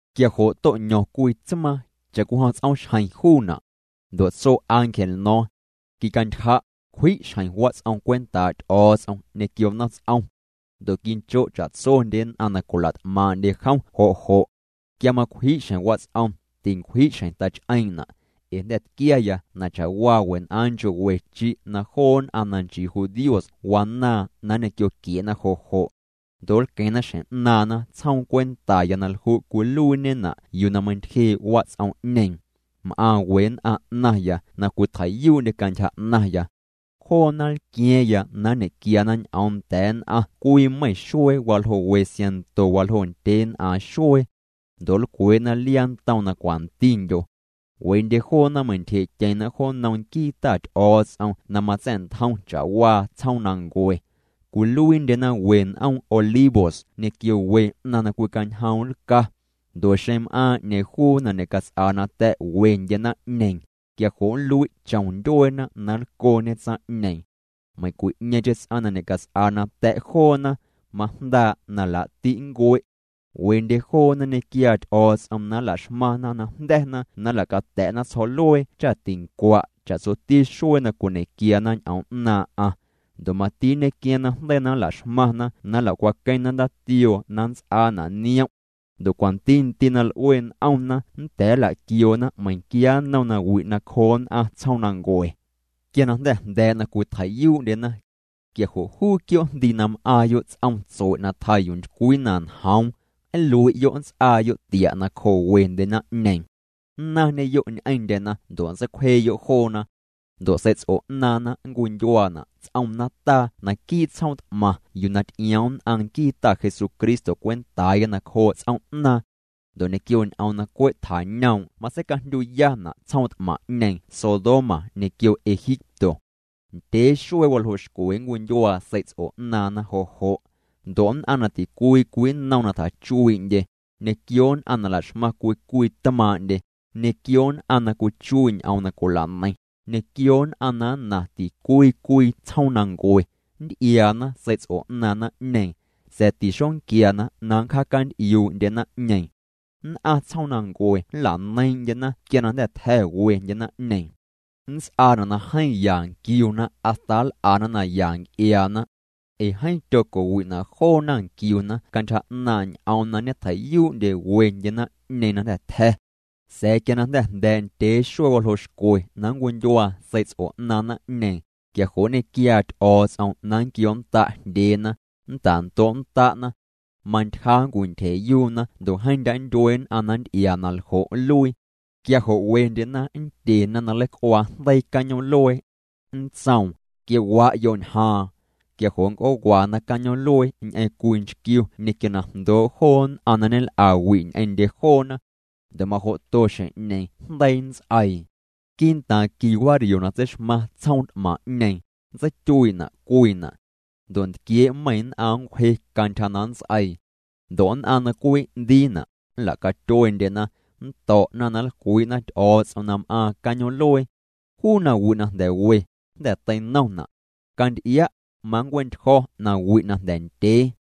Quia jo' to'ño̱ⁿ cwii tsmaaⁿ, cha'cwijom ts'oomxjeⁿ juuna'. Ndo' tso ángel no̱o̱ⁿ: —Quicantyja', cwji' xjeⁿ wats'om cwentaa' Ty'o̱o̱ts'om ñequio nomts'om. Ndo' quincho' cha'tsondye nn'aⁿ na cwila't'maaⁿ'ndye jom jo' jo'. Quia macwji' xjeⁿ wats'om, tincwji' xjeⁿ tach'eeⁿ'na'. Ee jnda̱ tquiaya na cha'waa wen'aaⁿ nchoo' we chi' na joo nn'aⁿ na nchii judíos wanaaⁿ na ñequioquie'na jo' jo'. Ndo' nlqueⁿna xjeⁿ 'naaⁿna tsjoom cwentaya na lju' cwiluiiñena' yuu na meintyjee' wats'om'ñeeⁿ. M'aⁿ we nn'aⁿ 'naⁿya na cwitjei'yuu'ndye cantyja 'naⁿya. Joona nlqua̱a̱ⁿya na nñe'quiana ñ'oom nda̱a̱ nn'aⁿ cwii meiⁿ xuee waljoo' we siaⁿnto waljoo' ndyeen'aaⁿ xuee. Ndo' nlcwee'na liaa ntom na cwantindyo. Wendye joona meintyjee'tyeⁿna jo nnom nquii Ta Ty'o̱o̱ts'om na matsa̱'ntjom cha'waa tsjoomnancue. Cwiluiindyena we n'oom olivos ñequio we 'naⁿ na cwicañjoom' nlca. Ndo' xeⁿ m'aaⁿ 'ñeeⁿ juu na ñecats'aa nata̱' wendye naⁿ'ñeeⁿ, quia jo' nlui' chom ndyueena na nlcoñe tsaⁿ'ñeeⁿ. Meiⁿcwi'ñeeⁿcheⁿ ts'aⁿ na ñe'cats'aa nata̱' joona, majndaa' na laa'ti' nncue'. Wendye joona nñequiaa Ty'o̱o̱ts'om na nla'xmaⁿna najnda̱na na nla'cata̱'na tsjo̱'luee cha tincua' cha'tsoti xuee na cwiñequiana ñ'oom 'naaⁿ'aⁿ. Ndo' mati nñequiaaⁿ najndeii na nla'xmaⁿna na nla'cwaqueⁿna ndaatioo na nnts'aana' niom'. Ndo' cwanti ndii' na l'ue n'omna nnda̱a̱ nla'quioona meiⁿnquia nnom nawi' nacjoo nn'aⁿ tsjoomnancue. Quia na jnda̱ jnda̱a̱' na cwitjei'yuu'ndyena, quia jo' juu quioo' jndii na m'aaⁿyo' ts'om tsue' na tjaa yuu ntycwii na njoom, nlui'yo' nnts'aayo' tia' nacjoo wendye naⁿ'ñeeⁿ. Nnaⁿñeyo' ñ'eⁿndyena ndo' nntseicwjeeyo' joona. Ndo' sei'ts'o 'naaⁿna nncwindyuaana' ts'om nataa naquii' tsjoom t'maⁿ yuu na ty'ioom nn'aⁿ nquii Ta Jesucristo cwentaaya nacjoo' ts'oom'naaⁿ. Ndo' ñequio ñ'oom na cwe' tjañoom' matseicajndyuyana' tsjoom t'maⁿ'ñeeⁿ Sodoma ñequio Egipto. Ndyee xuee waljoo' xcwe nncwindyuaa sei'ts'o 'naaⁿna jo' jo'. Ndo' nn'aⁿ na ticwii cwii nnom na tjachuii'ndye, ñequio nn'aⁿ na la'xmaⁿ cwii cwii tmaaⁿ'ndye, ñequio nn'aⁿ na cwichuii' ñ'oom na cwila'neiⁿ, ñequio nn'aⁿ na nnaⁿ ticwii cwii tsjoomnancue, nnty'iaana sei'ts'o 'naaⁿ naⁿ'ñeeⁿ, sa̱a̱ tixonquiana na nncjaacant'iuu'ndye naⁿ'ñeeⁿ. Nn'aⁿ tsjoomnancue nla'neiiⁿ'ndyena quia na jnda̱ tja̱ wendye naⁿ'ñeeⁿ. Nnts'aana' na jeeⁿ ya nquiuna hasta nl'ana naya nc'iaana. Ee jeeⁿ tyoco'wi'na' joona nquiuna cantyja 'naaⁿ' ñ'oom na ñetjei'yuu'ndye wendye naⁿ'ñeeⁿ na jnda̱ tja̱. Sa̱a̱ quia jnda̱ jnda̱a̱' ndyee xuee waljoo' xcwe na nncwindyuaa sei'ts'o 'naaⁿ naⁿ'ñeeⁿ, quia jo' nñequiaa Ty'o̱o̱ts'om na nnquioonnda' jndyeena, nnta'ndo'nnda'na. Mantyja nncwintyjee'yuna ndo' jeeⁿ ndya' nntyue nn'aⁿ na nnty'iaa na ljo' nluii. Quia jo' wendyena nndyena na nleic'uaa jndeii cañoom'luee. Nntsoom: —Quio'wa'yo' ñjaaⁿ. Quia jo' nnc'oowana cañoom'luee ñ'eⁿ cwii nchquiu ñequio na jndoo' joo nn'aⁿ na ñel'awi' ñ'eⁿndye joona. Ndo' majo'to xjeⁿ'ñeeⁿ jndeii nnts'eii. Quii'ntaaⁿ qui wario na tseixmaⁿ tsjoom t'maⁿ'ñeeⁿ, nntseityuii'na' cwiina'. Ndo' ntquiee' meiⁿ nn'aⁿ nncwje cantyja na nnts'eii. Ndo' nn'aⁿ na cwin'ndiina', nla'catyuendyena, nnto̱'na na nlcwii'na Ty'o̱o̱ts'om na m'aaⁿ cañoom'luee. Juu nawi' na jnda̱ we, jnda̱ teinomna'. Canty'ia', manncue'ntyjo̱ nawi' na jnda̱ ndyee.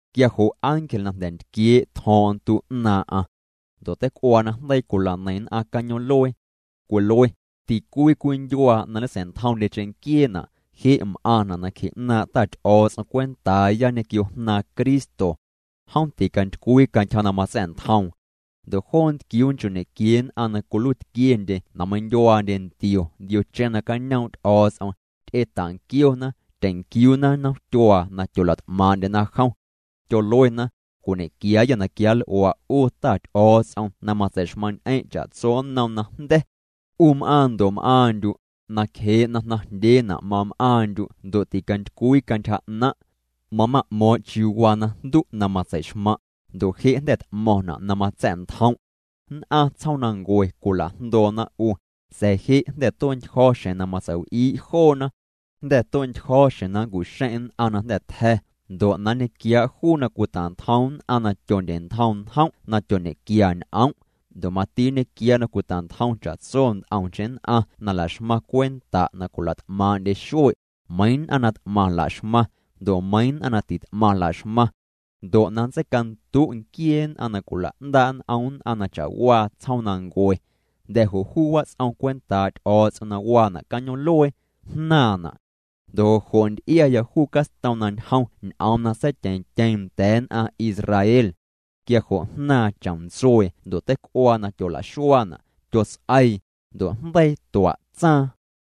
Quia jo' ángel na jnda̱ ntquiee' tjo̱o̱ⁿ'o̱ⁿ ntu 'naaⁿ'aⁿ. Ndo' teic'uaa na jndeii cwila'neiⁿ nn'aⁿ cañoom'luee. Cwilue: Ticwii cwii ndyuaa na ñesa̱'ntjomndye cheⁿnquieena', je' m'aⁿna' nacje 'naaⁿ' Ta Ty'o̱o̱ts'om cwentaaya ñequio Jnaaⁿ Cristo. Jom ticantycwii cantyja na matsa̱'ntjoom. Ndo' joo ntquiuu nchoo' ñequiee nn'aⁿ na cwiluiitquiendye na meindyuaandye ntio ndiocheⁿ nacañoom' Ty'o̱o̱ts'om, ty'eta'nquiona, tyeⁿnquiuuna nomtyuaa na tyola't'maaⁿ'ndyena jom. Tyoluena: Cwiñe'quiaayâ na quianl'ua' 'u Ta Ty'o̱o̱ts'om na matsei'xmaⁿ'ñ'eⁿ' cha'tso nnom najnda̱. 'U m'aaⁿ ndo' m'aaⁿndyu', nacjee' na jnaⁿjndyeena' mam'aaⁿndyu' ndo' ticantycwii cantyja 'naⁿ'. Mama'mo̱o̱ⁿ' chiuu waa najndu' na matsei'xmaⁿ', ndo' je' jnda̱ t'mo̱ⁿna' na matsa̱'ntjom'. Nn'aⁿ tsjoomnancue cwila'jndoona 'u, sa̱a̱ je' jnda̱ tue'ntyjo̱ xjeⁿ na matsei'w'ii' joona. Jnda̱ tue'ntyjo̱ xjeⁿ na nncu'xeⁿ' nn'aⁿ na jnda̱ tja̱, ndo' na nñequiaa' juu na cwita'ntjom nn'aⁿ na tyondye'ntjom njom' na tyoñequia ñ'om'. Ndo' mati nñequiaa' na cwita'ntjom cha'tso nt'omcheⁿ nn'aⁿ na la'xmaⁿ cwenta' na cwila't'maaⁿ'ndye xue', meiiⁿ nn'aⁿ na t'maⁿ la'xmaⁿ, ndo' meiiⁿ nn'aⁿ na tit'maⁿ la'xmaⁿ. Ndo' na nntseicandu' nquiee nn'aⁿ na cwila'ndaa' n'om nn'aⁿ na cha'waa tsjoomnancue. Jnda̱ jo' juu wats'om cwentaa' Ty'o̱o̱ts'om na waana' cañoom'luee, jnaaⁿna'. Ndo' jo' jo' nty'iaya juu castom na ñjom ñ'oom na seityeⁿtyeeⁿ nda̱a̱ nn'aⁿ Israel. Quia jo' jnaaⁿ chomntsuee ndo' teic'uaa na tyola'xuaana', tyots'eii, ndo' jndeii tua'tsaaⁿ.